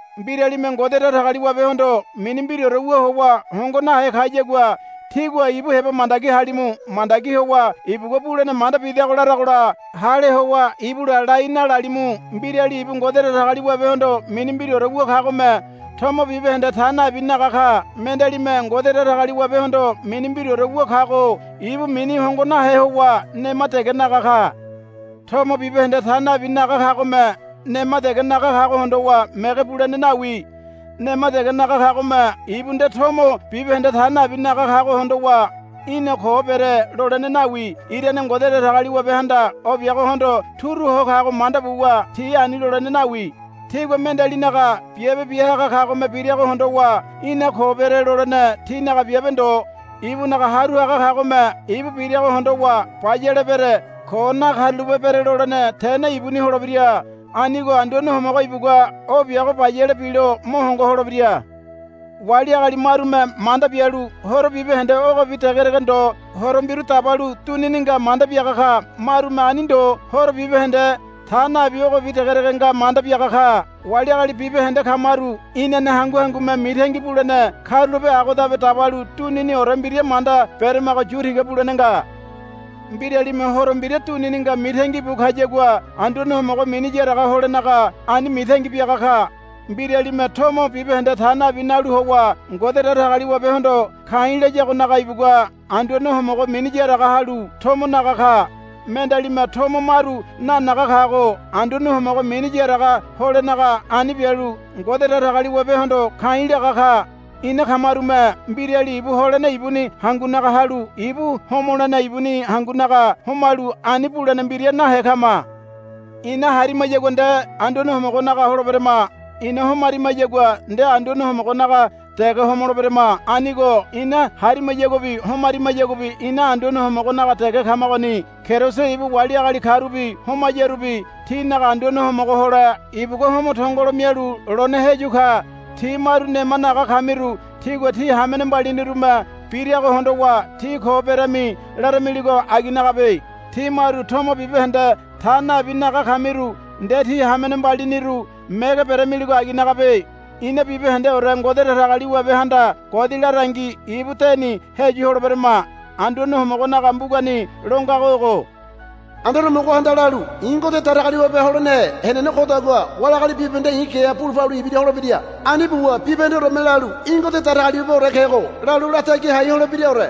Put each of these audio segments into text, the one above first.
Mbiralime Ngode Datagaliwabehondo mini mbiraore wu howa hongo nahe kayagua tígua ibu heba mandagi halimu. Mandagi howa ibugua bulene manda bidago laragola hale howa ibula lai nalalimu. Mbirali ibu Ngode Datagaliwabehondo mini mbiraore wu kagome tomo bibahende ta nabi naga ka. Mendealime Ngode Datagaliwabehondo mini mbiraore wu kago ibu mini hongo nahe howa nema dege naga ka. Tomo bibahende ta nabi naga kagome nema dege naga kago hondowa mege bulene nawi. Nema dege naga kagome ibu nde tomo bibahende ta nabi naga kago hondowa, Í̠na ko bere, lolene nawi. Irane Ngode Datagaliwabehanda o biagohondo turu ho kago manda buwa tí ani lolene nawi. Tígua mendealinaga biabe biahaga kagome birago hondowa, Í̠na ko bere, lolene tínaga biabe ndo. Ibunaga haru haga kagome ibu birago hondowa bayale bere ko nakarulape bere lolene tene ibuni holebira. Anigo Anduane Homogo ibugua o biago bayale bilo mo hongo holebira. Wali agali marume manda bialu horo bibahende ogobi degedege ndo horo mbiru dabalu dunini nga manda biaga ka. Marume ani ndo horo bibahende ta nabi ogobi degedege nga manda biaga ka. Wali agali bibahende kamaru inane hangu hangume mitangi bulene karulape agodabe dabalu duniniore mbira manda beremago yu tiga bulene nga. Mbiralime horo mbira dunini nga mitangi bu kayagua Anduane Homogo mini yaraga holenaga ani mitangi biaga ka. Mbiralime tomo bibahende ta nabi nalu howa Ngode Datagaliwabehondo ka̱i̱ layagonaga ibugua Anduane Homogo mini yaraga halu tomo naga ka. Mendealime tomo maru nanaga kago Anduane Homogo mini yaraga holenaga ani bialu Ngode Datagaliwabehondo ka̱i̱ laga ka. Ina kamarume mbirali ibu holene ibuni hangunaga halu ibu homolene ibuni hangunaga homalu ani bulene mbira nahe kama. Ina harimayagua nde Anduane Homogonaga holeberama. Ina homarimayagua nde Anduane Homogonaga dege homoleberama. Anigo ina harimayaguabi homarimayaguabi ina Anduane Homogonaga dege kamagoni. Keriso ibu wali agali karubi homayarubi tinaga Anduane Homogo hole ibugua homo tongolo mialu lone heyu ka. Tí maru nema naga kamiru tígua tí hamene mbalinirume birago hondowa, Tí ko berami, laramiligo aginagabe. Tí maru tomo bibahende ta nabi naga kamiru nde tí hamene mbaliniru mege beramiligo aginagabe. Ina bibahendeore Ngode Datagaliwabehanda godi larangi ibu deni heyu holeberama. Anduane Homogonaga mbugani lo ngago ogo, Anduane Homogohanda lalu, I̱ Ngode Datagaliwabe holenehe henene kodagua wali agali bibahende i̱ geha bulu palu ibira holebira. Ani buwa bibahendeoreme lalu, Í̠ Ngode Datagaliwabeore kego, lalu latagi hai holebiraore,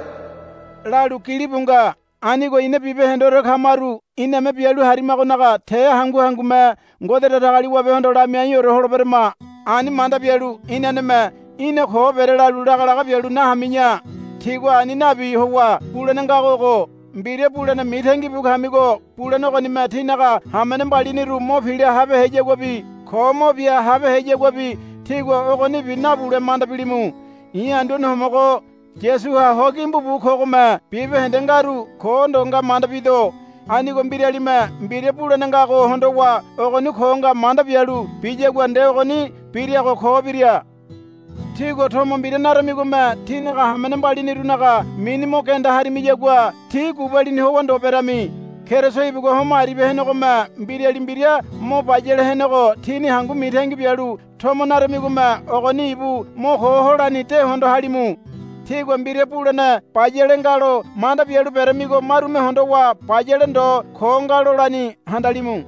lalu gilibu nga. Anigo ina bibahendeore kamaru iname bialu harimagonaga te hangu hangume Ngode Datagaliwabehondo lamiaiore holeberama. Ani manda bialu inaneme, Í̠na ko bere, lalu lagalaga bialu nahami̱ya. Tígua ani nabi howa bulene ngago ogo. Mbira bulene mitangi bu kamigo bulene ogonime tínaga hamene mbaliniru mo pila habeheyaguabi ko mo bia habeheyaguabi tígua ogonibi nabule manda bilimu. I̱ Anduane Homogo Yasuha ho gimbu bu kogome bibahende ngaru ko ndo nga manda bido. Anigo mbiralime mbira bulene ngago hondowa ogoni ko nga manda bialu biyagua nde ogoni birago ko bira. Tígua tomo mbira naramigome tínaga hamene mbalinirunaga mini mo genda harimiyagua tí gubalini howa ndo berami. Keriso ibugua homo aribia henegome mbirali mbira mo bayale henego tíni hangu mitangi bialu tomo narimigome ogoni ibu mo ko holani de hondo halimu. Tígua mbira bulene bayale nga lo manda bialu beramigo marume hondowa bayale ndo ko nga lolani handalimu.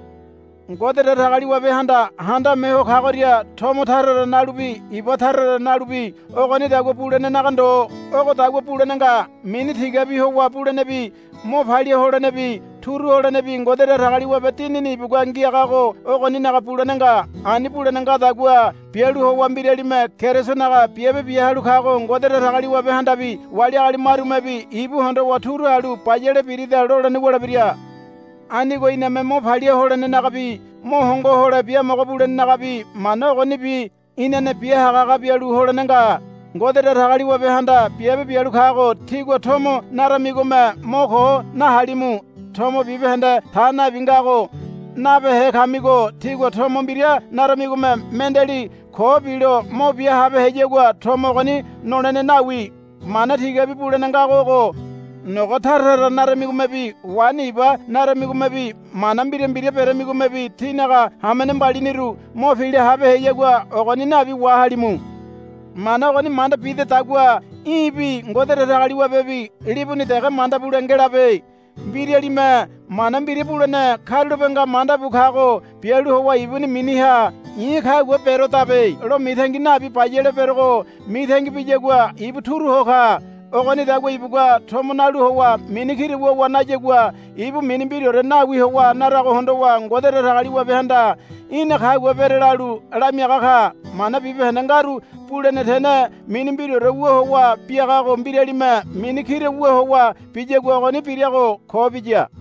Ngode Datagaliwabehanda handame Ho Kagoria tomo tara tara nalubi iba tara tara nalubi ogonidagua bulenenaga ndo. Ogodagua bulene nga. Mini tigabi howa bulenebi mo palia holenebi turu holenebi Ngode Datagaliwabe Dinini ibugua ngiagago ogoninaga bulene nga. Ani bulene ngadagua bialu howa mbiralime Kerisonaga biabe bia halu kago Ngode Datagaliwabehandabi wali agali marumebi ibu hondowa turu halu bayale birida lolene wulebira. Anigo iname mo palia holenenagabi mo hongo hole biamogo bulenenagabi mana ogonibi inane bia hagahaga bialu holene nga. Ngode Datagaliwabehanda biabe bialu kago tígua tomo naramigome mo ko nahalimu. Tomo bibahende ta nabi ngago nabehe kamigo tígua tomo mbira naramigome mendeali ko bilo mo bia habeheyagua tomo ogoni nolene nawi. Mana tigabi bulene ngago ogo. Nogo tara tara naramigomebi waini iba naramigomebi mana mbira mbira beramigomebi tínaga hamene mbaliniru mo pila habeheyagua ogoni nabi wahalimu. Mana ogoni manda bidedagua í̠bi Ngode Datagaliwabebi libuni dege manda bule ngelabe. Mbiralime mana mbira bulene karulape nga manda bu kago bialu howa ibuni miniha, I̱ kagua berodabe, lo mitangi nabi bayale berogo mitangi biyagua ibu turu ho ka. Ogonidagua ibugua tomo nalu howa mini kira wuwa nayagua ibu mini mbiraore nawi howa narago hondowa Ngode Datagaliwabehanda, Í̠na kagua bere, lalu lamiaga ka. Mana bibahende ngaru bulene tene mini mbiraore wu howa biagago mbiralime mini kira wu howa biyagua ogoni birago ko biya.